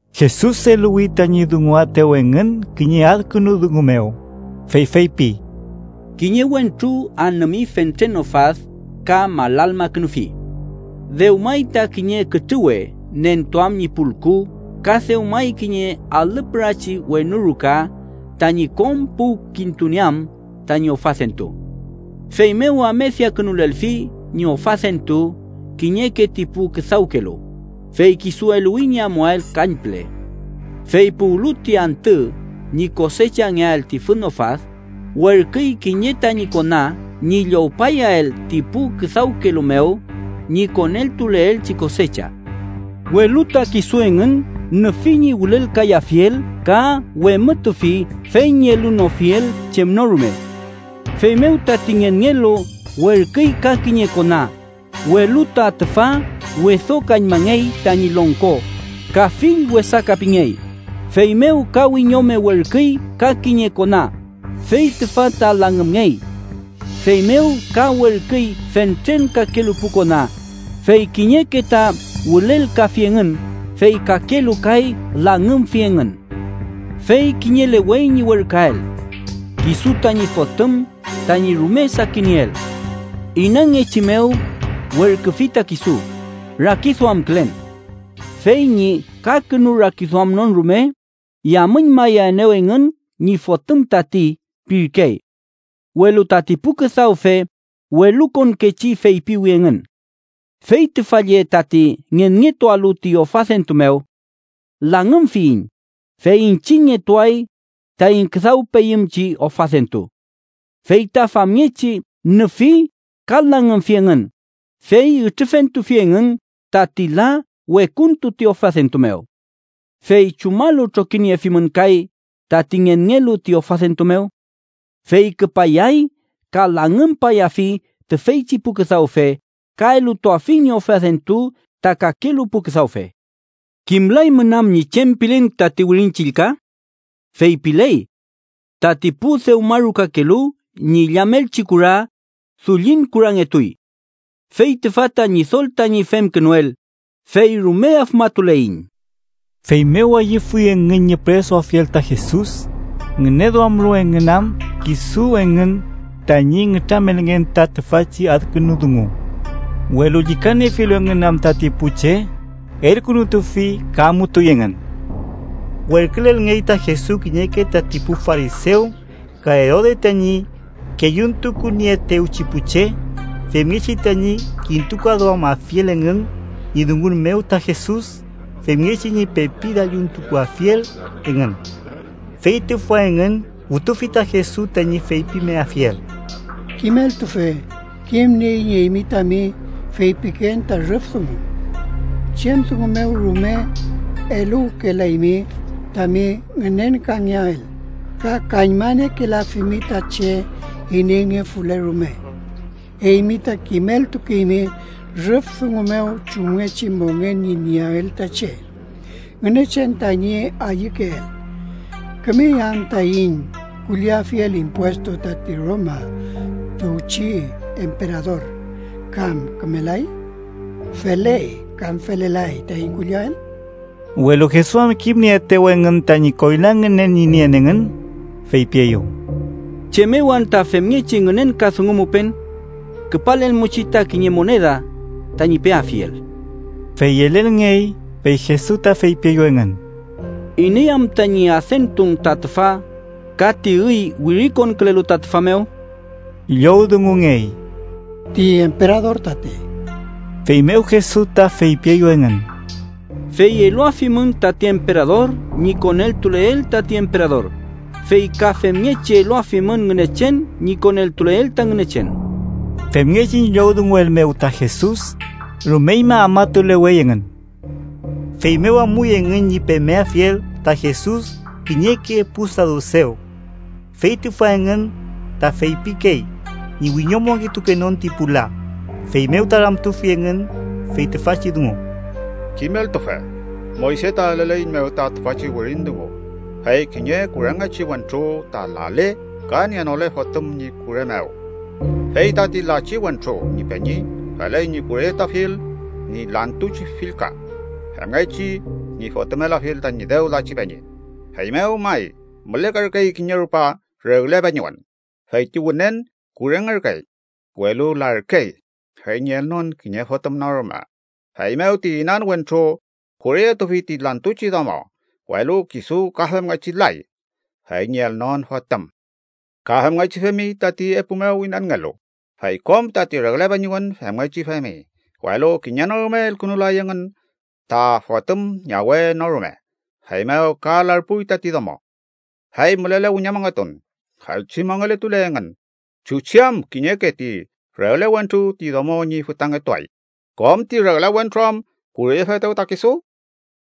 Jesus eluwi tañi dunguaetew engün kiñe adkünu dungu mew, fey feypi: “Kiñe wentru anümi fentren ofad ka malalmakünufi. Dewmay ta kiñe kütrüwe nentuam ñi pulku ka dewmay kiñe alü pürachi wenu ruka tañi kom puwkintunieam tañi ofadentu. Feymew amediakünulelfi ñi ofadentu kiñeke ti pu küdawkelu, fey kisu eluwi ñi amuael kañpüle. Fey puwlu ti antü ñi kosechangeael ti fün ofad, werküy kiñe tañi kona ñi llowpayael ti pu küdawkelu mew ñi koneltuleelchi kosecha. Welu ta kisu engün nüfi ñi wülelkayafiel ka wemütufi fey ñi elunofiel chem no rume. Feymew tati ngenngelu werküy ka kiñe kona, welu ta tüfa wedokañmangey tañi longko ka fill wesaka pingey. Feymew ka wiñome werküy ka kiñe kona, fey tüfa ta langümngey. Feymew ka werküy fentren kakelu pu kona, fey kiñeke ta wülelkafi engün, fey kakelu kay langümfi engün. “Fey kiñelewey ñi werküael: kisu tañi fotüm tañi rume sakinieel. Inangechi mew werküfi ta kisu, rakiduamkülen: ‘Fey ñi kakünu rakiduamnon rume, yamüñmayaenew engün ñi fotüm tati’ pirkey. “Welu tati pu küdawfe welukonkechi feypiwi engün: ‘Fey tüfa lle tati ngenngetualu ti ofadentu mew. Langümfiyiñ, fey iñchiñngetuay taiñ küdawpeyümchi ofadentu.’ Fey ta famngechi nüfi ka langümfi engün, fey ütrüfentufi engün tati la wekuntu ti ofadentu mew. “¿Fey chumalu trokiniefimün kay tati ngenngelu ti ofadentu mew? Fey küpayay ka langümpayafi tüfeychi pu küdawfe, ka elutuafi ñi ofadentu ta kakelu pu küdawfe. “¿Kimlaymün am ñi chem pilen tati Wirin Chillka? Feypiley: ‘Tati pu dewmarukakelu ñi illamelchi kura, dullin kurangetuy. Fey tüfa ta Ñidol tañi femkünuel, fey rume afmatuleiñ.’” Feymew ayüfuy engün ñi püresuafiel ta Jesus, ngüneduamlu engün am kisu engün tañi nütramelngen ta tüfachi adkünu dungu. Welu llükaniefilu engün am tati pu che, elkünutufi ka amutuy engün. Werkülelngey ta Jesus kiñeke tati pu farisew ka Erode tañi kelluntukunieetewchi pu che, femngechi tañi kintukaduamafiel engün ñi dungun mew ta Jesus femngechi ñi pepi dalluntukuafiel engün. Fey tüfa engün wütufi ta Jesus tañi feypimeafiel: —Kimeltufe, kimnieiñ eymi tami feypiken ta rüf dungu. Chem dungu mew rume eluwkelaymi tami ngünenkangeael, ka kañmaniekelafimi ta che ineyngefule rume. Eymi ta kimeltukeymi rüf dungu mew chumngechi mongen ñi nieael ta che, Ngünechen tañi ayükeel. ¿Kümey am taiñ kulliafiel impuestu tati Roma tuwchi emperador, kam kümelay? ¿Feley kam felelay taiñ kulliael? Welu Jesus am kimnieetew engün tañi koyla ngünen ñi nien engün, feypieyew: —¿Chem mew anta femngechi ngünenkadungumupen? Küpalelmuchi ta kiñe moneda, tañi peafiel. Fey yelelngey, fey Jesus ta feypieyew engün: —¿Iney am tañi adentun ta tüfa ka ti üy wirikonkülelu ta tüfa mew? Llowdungungey: —Ti emperador tati. Feymew Jesus ta feypieyew engün: —Fey eluafimün tati emperador ñi koneltuleel tati emperador, fey ka femngechi eluafimün Ngünechen ñi koneltuleel ta Ngünechen. Femngechi ñi llowdunguel mew ta Jesus, rumeñma afmatulewey engün. Feymew amuy engün ñi pemeafiel ta Jesus kiñeke pu sadusew. Fey tüfa engün ta feypikey ñi wiñomongetukenon ti pu la, feymew ta ramtufi engün fey tüfachi dungu: —Kimeltufe, Moyse ta eleleiñmew ta tüfachi wirin dungu fey kiñe kurengechi wentru ta lale ka nienole fotüm ñi kure mew, fey tati lachi wentru ñi peñi feley ñi kureyetuafiel ñi lantuchi fillka, femngechi ñi fotümeltuafiel tañi dew lachi peñi. Feymew may, mülekerkey kiñe rupa regle peñiwen, fey ti wünen kurengerkey, welu larkey, fey ñi elnon kiñe fotüm no rume. Feymew ti inan wentru kureyetufi ti lantuchi domo, welu kisu ka femngechi lay fey ñi elnon fotüm. Ka femngechi femi tati epu mew inanngelu, fey kom tati regle peñiwen femngechi femi, welu kiñe no rume elkünulay engün ta fotüm ñawe no rume. Feymew ka larpuy tati domo. Fey, mülele wiñomongetun, feychi mongeletule engün, ¿chuchi am kiñeke ti regle wentru ti domo ñi fütangetuay, kom ti regle wentru am kureyefetew ta kisu?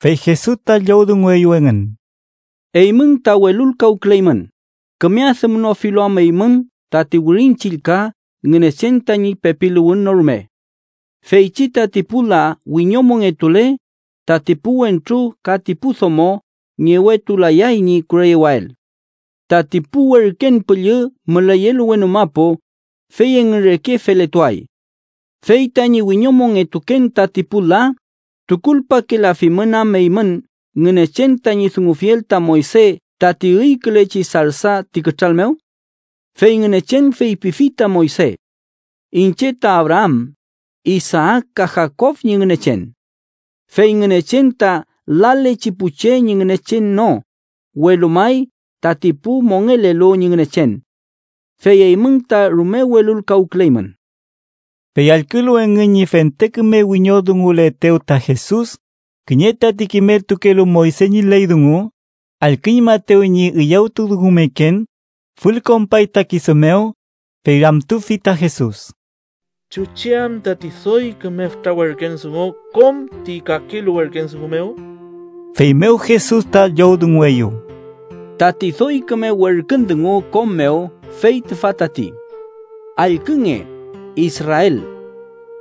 Fey Jesus ta llowdungueyew engün: —Eymün ta welulkawküleymün, küme adümnofilu am eymün tati Wirin Chillka Ngünechen tañi pepiluwün no rume. Feychi tati pu la wiñomongetule, tati pu wentru ka ti pu domo ngewetulayay ñi kureyewael. Tati pu werken püllü müleyelu wenu mapu, fey engün reke feletuay. Fey tañi wiñomongetuken tati pu la, ¿tukulpakelafimün am eymün Ngünechen tañi dungufiel ta Moyse tati üykülechi sarsa ti kütral mew? Fey Ngünechen feypifi ta Moyse: ‘Iñche ta Abraam, Isaak ka Jakob ñi Ngünechen’. ¡Fey Ngünechen ta lalechi pu che ñi Ngünechen no, welu may tati pu mongelelu ñi Ngünechen! Fey eymün ta rume welulkawküleymün. Fey allkülu engün ñi fente küme wiñoldunguletew ta Jesus, kiñe tati kimeltukelu Moyse ñi ley dungu allküñmaetew ñi üyawtudungumeken, fülkonpay ta kisu mew, fey ramtufi ta Jesus: —¿Chuchi am tati doy küme fütra werkün dungu kom ti kakelu werkün dungu mew? Feymew Jesus ta llowdungueyew: —Tati doy küme werkün dungu kom mew fey tüfa tati: ‘Allkünge, Israel: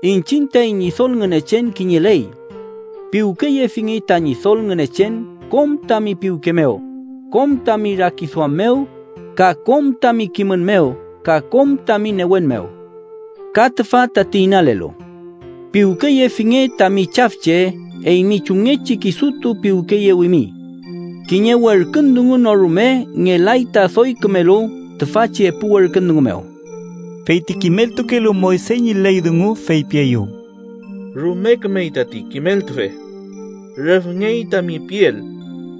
iñchiñ taiñ Ñidol Ngünechen kiñeley. Piwkeyefinge ta Ñidol Ngünechen kom tami piwke mew, kom tami rakiduam mew, ka kom tami kimün mew ka kom tami newen mew.’ Ka tüfa tati inalelu: ‘Piwkeyefinge tami chafche eymi chumngechi kisutu piwkeyewimi.’ Kiñe werkün dungu no rume ngelay ta doy kümelu tüfachi epu werkün dungu mew. Fey ti kimeltukelu Moyse ñi ley dungu feypieyew: —Rume kümey tati, kimeltufe. Rüfngey tami piel: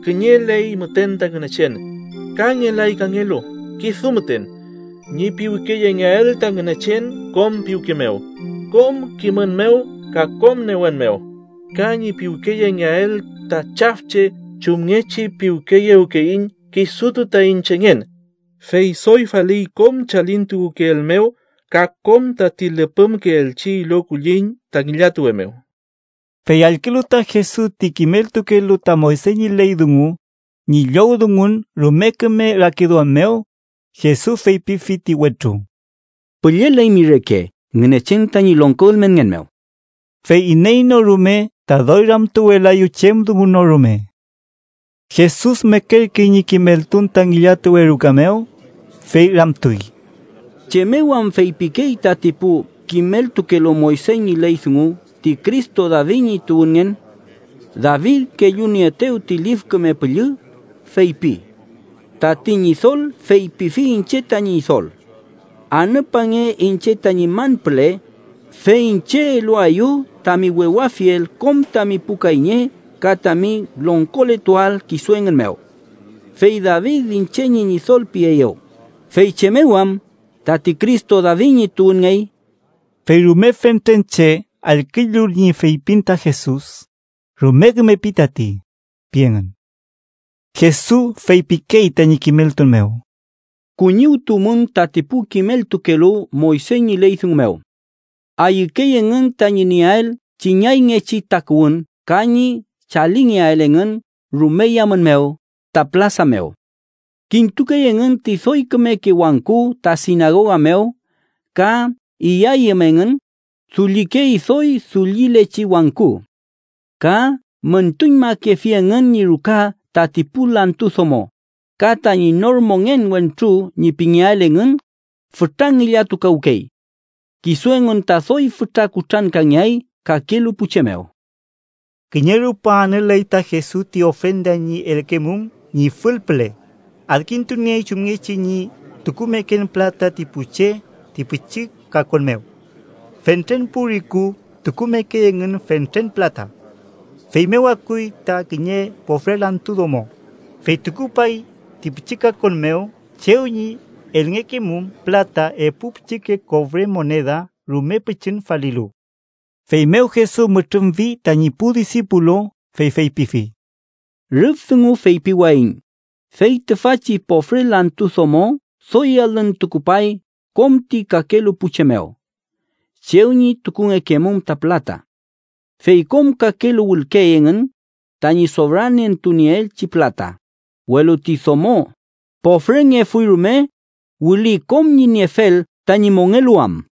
Kiñeley müten ta Ngünechen, ka ngelay kangelu kisu müten. Ñi piwkeyengeael ta Ngünechen kom piwke mew, kom kimün mew ka kom newen mew, ka ñi piwkeyengeael ta chafche chumngechi piwkeyewkeyiñ kisutu taiñ chengen, fey doy faliy kom chalintukukeel mew ka kom tati lüpümkeelchi ilo kulliñ ta ngillatuwe mew. Fey allkülu ta Jesus ti kimeltukelu ta Moyse ñi ley dungu ñi llowdungun rume küme rakiduam mew, Jesus feypifi ti wentru: —Pülleleymi reke Ngünechen tañi longko ülmenngen mew. Fey iney no rume ta doy ramtuwelaeyew chem dungu no rume. Jesus mekerkey ñi kimeltun ta ngillatuwe ruka mew, fey ramtuy: —¿Chem mew am feypikey tati pu kimeltukelu Moyse ñi ley dungu ti Cristo David ñi tuwünngen? David, kellunieetew ti Lif Küme Püllü, feypi: ‘Tati Ñidol feypifi iñche tañi Ñidol: Anüpange iñche tañi man püle, fey iñche eluaeyu tami wewafiel kom tami pu kayñe ka tami longkoletuael kisu engün mew.’ Fey David ‘iñche ñi Ñidol’ pieyew, ¿fey chem mew am tati Cristo David ñi tuwünngey? Fey rume fentren che, allkülu ñi feypin ta Jesus, “rume küme pi tati” pi engün. Jesus feypikey tañi kimeltun mew: “Kuñiwtuwmün tati pu kimeltukelu Moyse ñi ley dungu mew. Ayükey engün tañi nieael chiñayngechi takuwün ka ñi chalingeael engün rume yamün mew ta pülasa mew. Kintukey engün ti doy kümeke wangku ta sinagoga mew ka iyayüm engün, dullikey doy dullilechi wangku. Ka müntuñmakefi engün ñi ruka tati pu lantu domo, ka tañi nor mongen wentru ñi pingeael engün, fütra ngillatukawkey. Kisu engün ta doy fütra kutrankangeay kakelu pu che mew.” Kiñe rupa anüley ta Jesus ti ofrenda ñi elngekemum ñi fül püle, adkintuniey chumngechi ñi tukumeken pülata ti pu che ti pichi kakon mew. Fentren pu riku tukumekey engün fentren pülata. Feymew akuy ta kiñe pofre lantu domo, fey tukupay ti pichi kakon mew chew ñi elngekemum pülata epu pichike kofre moneda, rume pichin falilu. Feymew Jesus mütrümfi tañi pu disipulu, fey feypifi: —Rüf dungu feypiwayiñ fey tüfachi pofre lantu domo doy alün tukupay kom ti kakelu pu che mew chew ñi tukungekemum ta pülata. Fey kom kakelu wülkey engün tañi sofrantunieelchi pülata, welu ti domo, pofrengefuy rume, wüli kom ñi niefel tañi mongeluwam.